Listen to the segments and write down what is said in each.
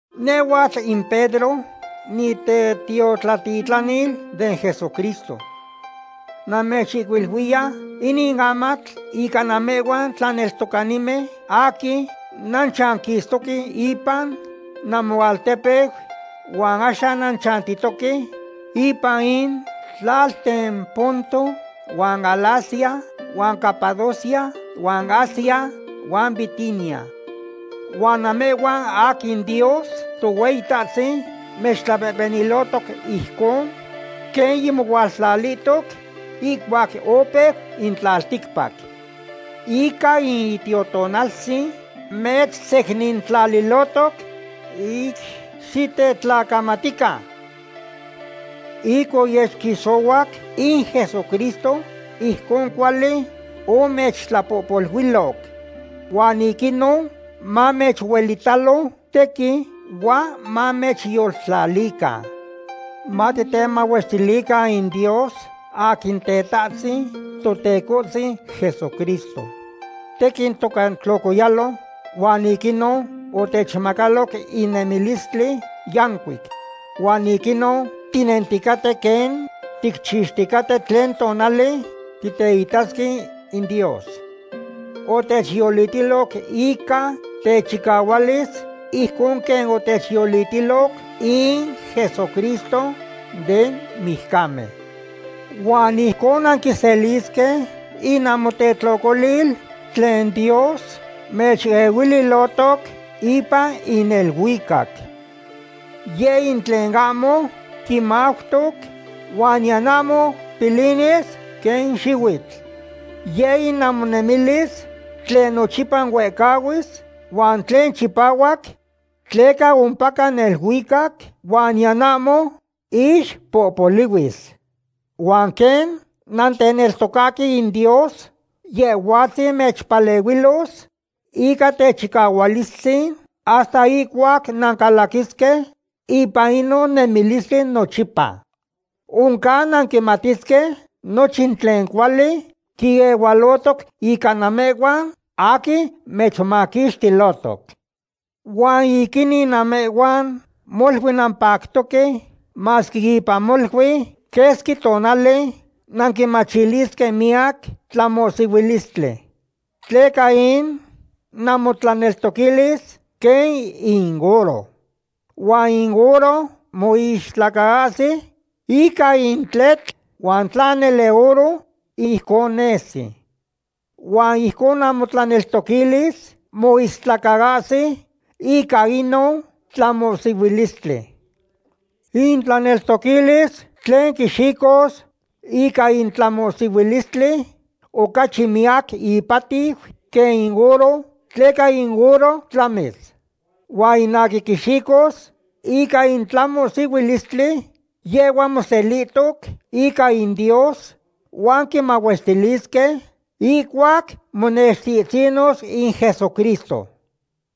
Nehhuatl in Pedro nitetiotlatitlanil den Jesucristo. Namechihcuiluiya inin amatl ica namehhuan tlaneltocanimen aquin nanchanquistoque ipan namoaltepeu huan axan nanchantihtohque ipan in tlalten Ponto, huan Galacia, huan Capadocia, huan Asia, huan Bitinia. Huan namehhuan aquin Dios Tohueyitahtzin mechtlapehpenilohtoc ijcon quen yimotlalihtoc ihcuac opeu in tlalticpac. Ica in Itiotonaltzin mechsecnintlalilohtoc ic xitetlacamatican. Ic oyesquixohuac in Jesucristo, ijcon cuali omechtlapohpoluiloc. Huan ic inon mamechuelitalo tequin huan mamechyoltlalican. Matitemahuestilican in Dios aquin Tetahtzin Totecohtzin Jesucristo. Tequin toca tlocoyalo, huan ic inon otechmacaloc in nemilistli yancuic. Huan ic inon tinenticaten quen ticchixticaten tlen tonali titeitasque in Dios. Otechyolitiloc ica techicahualis ijcon quen oteyolitilo in Jesucristo den mijcamen. Huan ijcon nanquiselisque in namotetlocolil tlen Dios mechehuililohtoc ipan in neluicac. Yeh in tlen ahmo quimautoc huan niyan ahmo pilinis quen in xihuitl. Yeh in namonemilis tlen nochipa huehcahuis, huan tlen chipahuac tleca ompaca neluicac, huan niyan ahmo ixpohpolihuis. Huan quen nanteneltocahque in Dios, Yehhuatzin mechpalehuilos ica techicahualistzin hasta ihcuac nancalaquisque ipan inon nemilistli nochipa. Oncan nanquimatisque nochin tlen cuali quiehualotoc ica namehhuan aquin mechmaquixtilohtoc. Huan ic inin namehhuan molui nampactoque, masque ipan molui quesqui tonali nanquimachilisque miyac tlamohsihuilistli. Tleca in namotlaneltoquilis quen in oro. Huan in oro moistlacaahsi ica in tletl, huan tla nele oro, ijcon nesi. Huan ijcon namotlaneltoquilis moistlacaahsi ica inon tlamohsihuilistli. In tlaneltoquilis tlen quixicos ica in tlamohsihuilistli, ocachi miyac ipatiu quen in oro, tleca in oro tlamis. Huan in aquin quixicos ica in tlamohsihuilistli, yehhua moselihtoc ica in Dios huan quimahuestilisque ihcuac monextihtzinos in Jesucristo.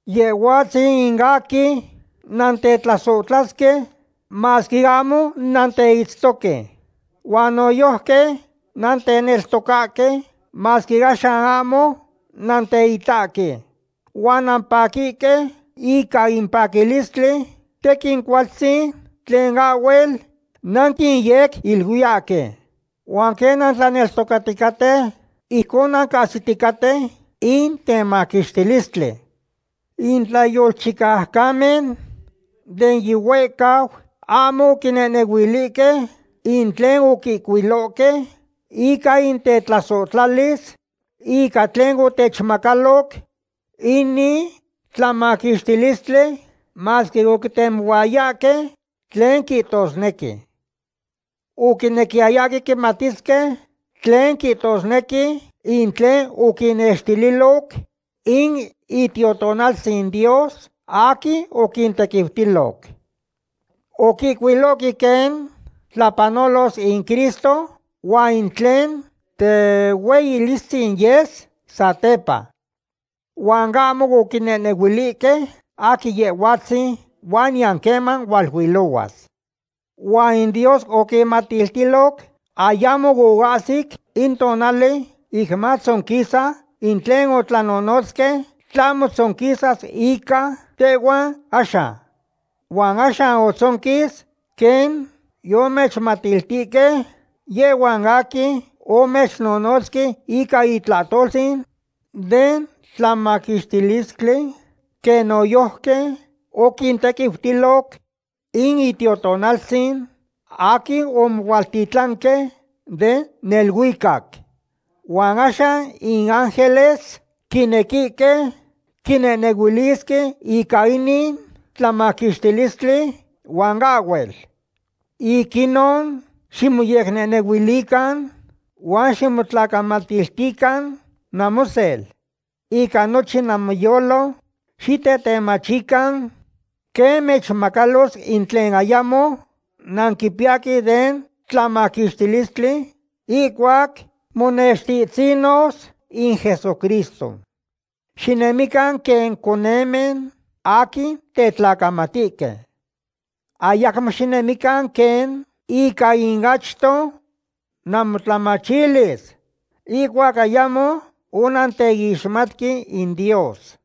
Yehhuatzin in aquin nantetlasohtlahque masque ahmo nanteitztoque. Huan noyojqui nanteneltocahque masque axan ahmo nanteitahque. Huan nampaquihque ica in paquilistli tequin cualtzin tlen ahhuel nanquiyequiluiyahque. Huan quen nanteneltocaticaten, ijcon nancahsiticaten in temaquixtilistli. In tlayolchicaucanimen den yihuehcau ahmo oquinehnehuilihque in tlen oquihcuilohque ica in tetlasohtlalis ica tlen otechmacaloc inin tlamaquixtilistli masque oquitemohuayahque tlen quihtosnequi. Oquinequiyayahque quimatisque tlen quihtosnequi in tlen oquinnextililo in Itiotonaltzin Dios aquin oquintequiutilo. Oquihcuilohque quen tlapanolos in Cristo huan in tlen tehueyilistzin yes satepa. Huan ahmo oquinehnehuilihque aquin Yehhuatzin huan niyan queman hualuilohuas. Huan in Dios oquinmatiltiloc ayamo oahsic in tonali ic matzonquisa in tlen otlanonotzque, tlahmo tzonquisas ica tehhuan axan. Huan axan otzonquis quen yomechmatiltihque yehhuan aquin omechnonotzque ica in itlahtoltzin den tlamaquixtilistli, quen noyojqui oquintequiutiloc in Itiotonaltzin aquin omohualtitlanque den neluicac. Huan axan in ángeles quinequihque quinehnehuilisque ica inin tlamaquixtilistli huan ahhuel. Ic inon ximoyecnehnehuilican huan ximotlacamatiltican namosel. Ica nochin namoyolo xitetemachican quen mechmacalos in tlen ayamo nanquipiyahque den tlamaquixtilistli ihcuac monextihtzinos in Jesucristo. Xinemican quen conemen aquin tetlacamatihque. Ayacmo xinemican quen ica in achto namotlamachilis ihcuac ayamo onanteixmatque in Dios.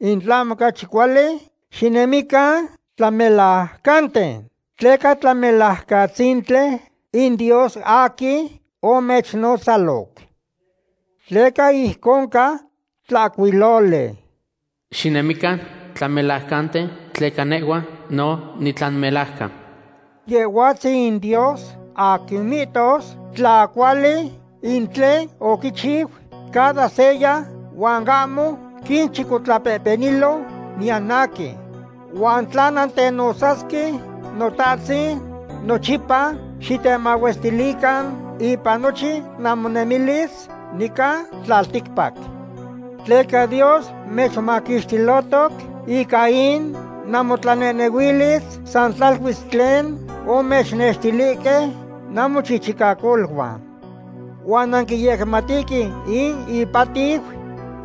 In tlahmo ocachi cuali, xinemican tlamelajcanten, tleca Tlamelajcatzintli in Dios aquin omechnotzaloc. Tleca ijcon ca tlahcuiloli: “Xinemican tlamelajcanten tleca nehhua no nitlamelajcan.” Yehhuatzin in Dios aquin mihtos tla cuali in tlen oquichiu cada seya, huan ahmo quinchicotlapehpenilo niyan aquin. Huan tla nantenotzasque “Notahtzin”, nochipa xitemahuestilican ipan nochin namonemilis nican tlalticpac. Tleca Dios mechmaquixtilohtoc ica in namotlanehnehuilis san tlaluis tlen omechnextilihque namochichicacoluan. Huan nanquiyecmatihque in ipatiu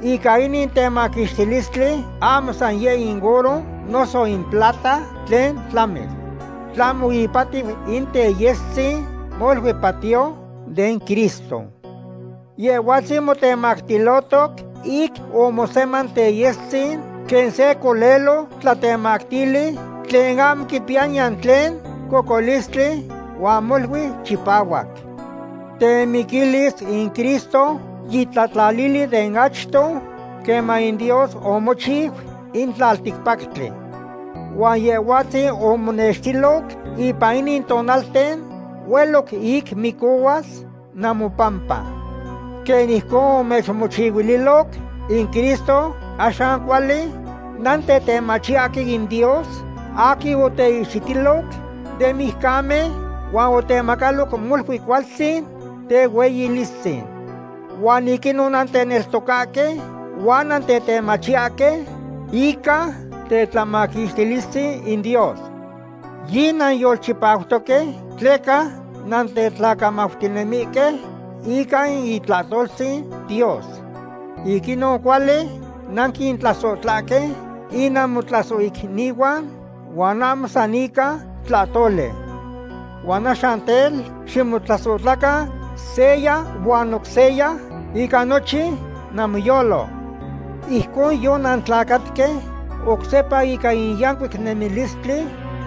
ica inin temaquixtilistli ahmo san yeh in oro noso in plata, tlen tlamis. Tlahmo ipatiu in teyestzin molui patiyo den Cristo. Yehhuatzin motemactilohtoc ic omoseman teyestzin quen se colelo tlatemactili, tlen ahmo quipiya niyan tlen cocolistli huan molui chipahuac. Temiquilis in Cristo yitlatlalili de achto queman in Dios omochiu in tlalticpactli. Huan Yehhuatzin omonextiloc ipan inin tonalten hueloc ic micohuas namopampa. Quen ijcon omechmochihuililoc in Cristo, axan cuali nantetemachiyahque in Dios aquin oteihxitiloc den mijcamen huan otemacaloc molui cualtzin tehueyilistzin. Huan ic inon nanteneltocahque huan nantetemachiyahque ica tetlamaquixtilistzin in Dios. Yinanyolchipautoque tleca nantetlacamautinemihque ica in itlahtoltzin Dios. Ic inon cuali nanquintlasohtlahque in namotlasohicnihuan huan ahmo san ica tlahtoli. Huan axan tel, ximotlasohtlacan seya huan oc seya ica nochin namoyolo. Ijcon yonantlacatque oc sepa ica in yancuic nemilistli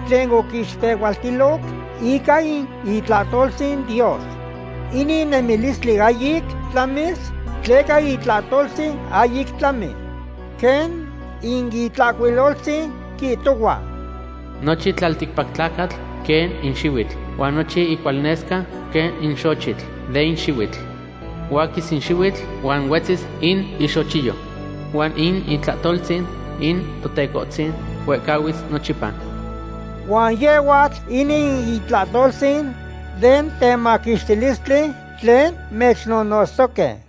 tlen oquixpehualtiloc ica in itlahtoltzin Dios. Inin nemilistli ahyic tlamis tleca itlahtoltzin ahyic tlamis. Quen in Itlahcuiloltzin quihtohua: Nochin tlalticpac tlacatl quen in xihuitl, huan nochin incualnesca quen in xochitl den xihuitl. Huaquis in xihuitl, huan huetzis in ixochiyo. Huan in itlahtoltzin in Totecohtzin huehcahuis nochipa. Huan yehhuatl inin in itlahtoltzin den temaquixtilistli tlen mechnonotztoque.